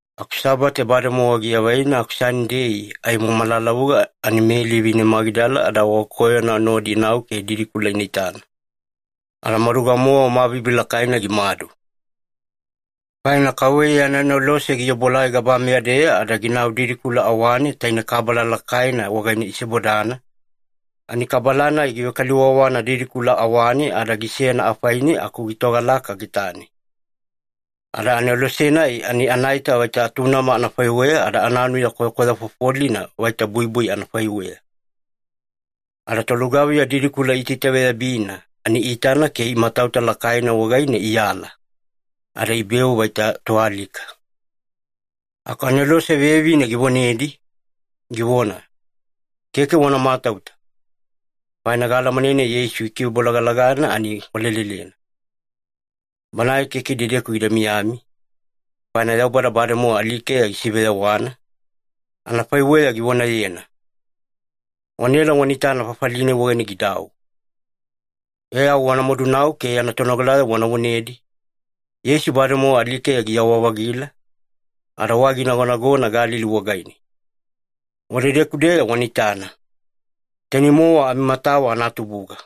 Aku Sabate bademowa giavaina aku Sanidei aimo malalavuga ani Meli vine Magidala ada wagakoyona nodi inau ke didikula ina itana. Ada maduga-mowa mabibi lakaina gimadu. Faina KAUVEYA yana anelose giobuelai gabameya-deya ada ginau didikula awane taine kabala lakaina wagaine isebodana, ani kabala-nai givekaliwawana didikula awane ada gisena afaine aku gitogalaka getane. Ada anelose-nai ani anaita vaita atunama anafaiweya ada ananuya kwayakwaya fofolina vaita buibui anafaiweya. Ada tolugaviya didikula iitaitaveyabina ani iitana ke imatauta lakaina wagaine iala. Ada ibeu vaita toalika. Aku anelose vevine givonedi, givona, “Keke wana matauta, faina gaalamanena Yeisu ikivebolagalagana ani walelelena. Banae keke idedeku gida miyami, faina Yaubada bademowa alikeya gisiveyawana, anafaiweya givonayena. Wanaela wana itana fafali-nai wagaine gidau. E au wana madunau ke yana tonogalayavo wana vonedi, ‘Yeisu bademowa alikeya giyawa-vagila, ada wai ginagonagona Galili wagaine. Wadedeku-deya wana itana.’ Tainei-mowa amimatawa anatubuga.”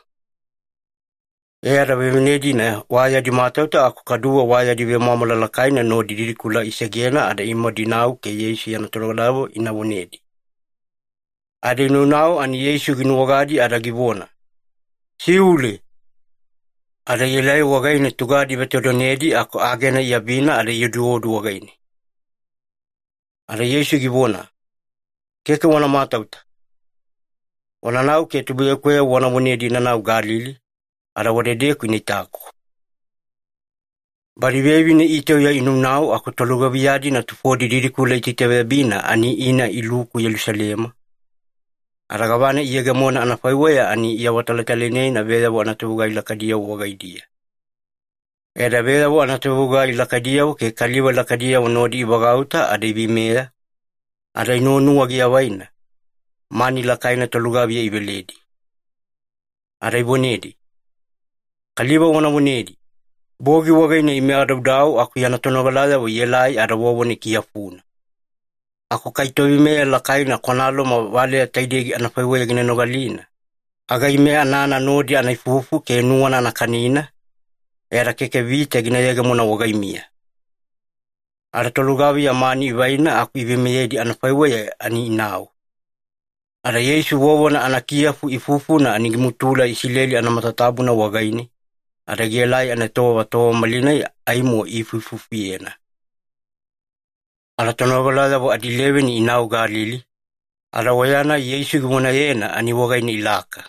E ada vevine-dina wa yadi matauta aku kaduwe wa yadi vemwamwala lakaina nodi didikula isegena ada imadu inau ke Yeisu yana tonogalayavo ina vonedi. Ada inaunau ani Yeisu ginuwagadi ada givona, “Siule!” Ada ielai wagaine tugadi ivetodonedi aku agena iabina ada ioduodu wagaine. Ada Yeisu givona, “Keke wana matauta. Wananau ke tubuiyakuweyavo wana vonedi inanau Galili, ada wadedeku ina itaku.” Badi vevine itauya inaunau aku tolugaviya-dina tufodi didikula iitaitaveyabina ani ina iluku Yelusalema, ada gavana iyegemona anafaiweya ani iawatalatalainena veyavo anatovegugai lakaidiyavo wagaidiya. E ada veyavo anatovegugai lakaidiyavo ke kaliva lakaidiyavo nodi ivagauta ada iveimeya, ada inuwanuwa giavaina, mani lakaina tolugaviya iveledi. Ada ivonedi, “Kaliva wana vonedi, ‘Bogi wagaine ime adaudau aku yana tonogalayavo ielai ada vovona ikiyafuna.’ Aku kai toveimeya lakaina kwana Loma valeya taidei anafaiweya gina nogalina, aga ime anana nodi ana ifufu ke nuwana ana kanina, e ada keke vita gina yegemona wagaimiya.” Ada tolugaviya mani ivaina aku iveimeyedi anafaiweya ani inau. Ada Yeisu vovona anakiyafu ifufuna ani gimutula Isileli anamatatabuna wagaine, ada gielai anaetowava tova malinai aimo iifuifufuyena. Ada tonogalayavo adileveni inau Galili, ada oya-nai Yeisu givonayena ani wagaine ilaka.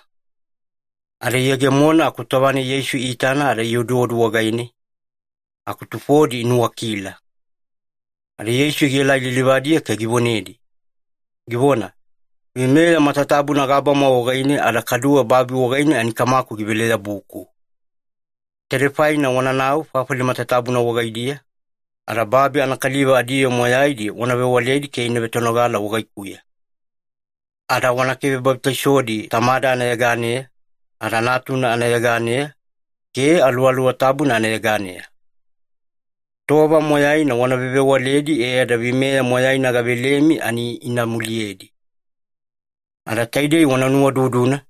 Ada iyegemona aku tova-nai Yeisu iitana ada ioduodu wagaine, aku tufodi inuwakila. Ada Yeisu gielai lilivadiya ke givonedi, givona, “Veimeya matatabuna gabama wagaine ada kaduwe babi wagaine ani Kamaku givele-yabuku. Taidei faina wananau fafali matatabuna wagaidiya, ada babi anakaliva adiyoo moyaidi wana vewaledi ke ina vetonogala wagaikuya. Ada wana kivebabitaisodi Tamada anayeganeya, ada Natuna anayeganeya, ke Aluwaluwa Tabuna anayeganeya. Tova moyaina wana vevewaledi e ada veimeya moyaina gavelemi ani ina muliyedi. Ada taidei wana nuwaududuna,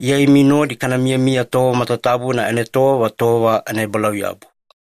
Iya imi nodi kana miyamiya tova matatabuna anaetowava tova anaebalauyabu.”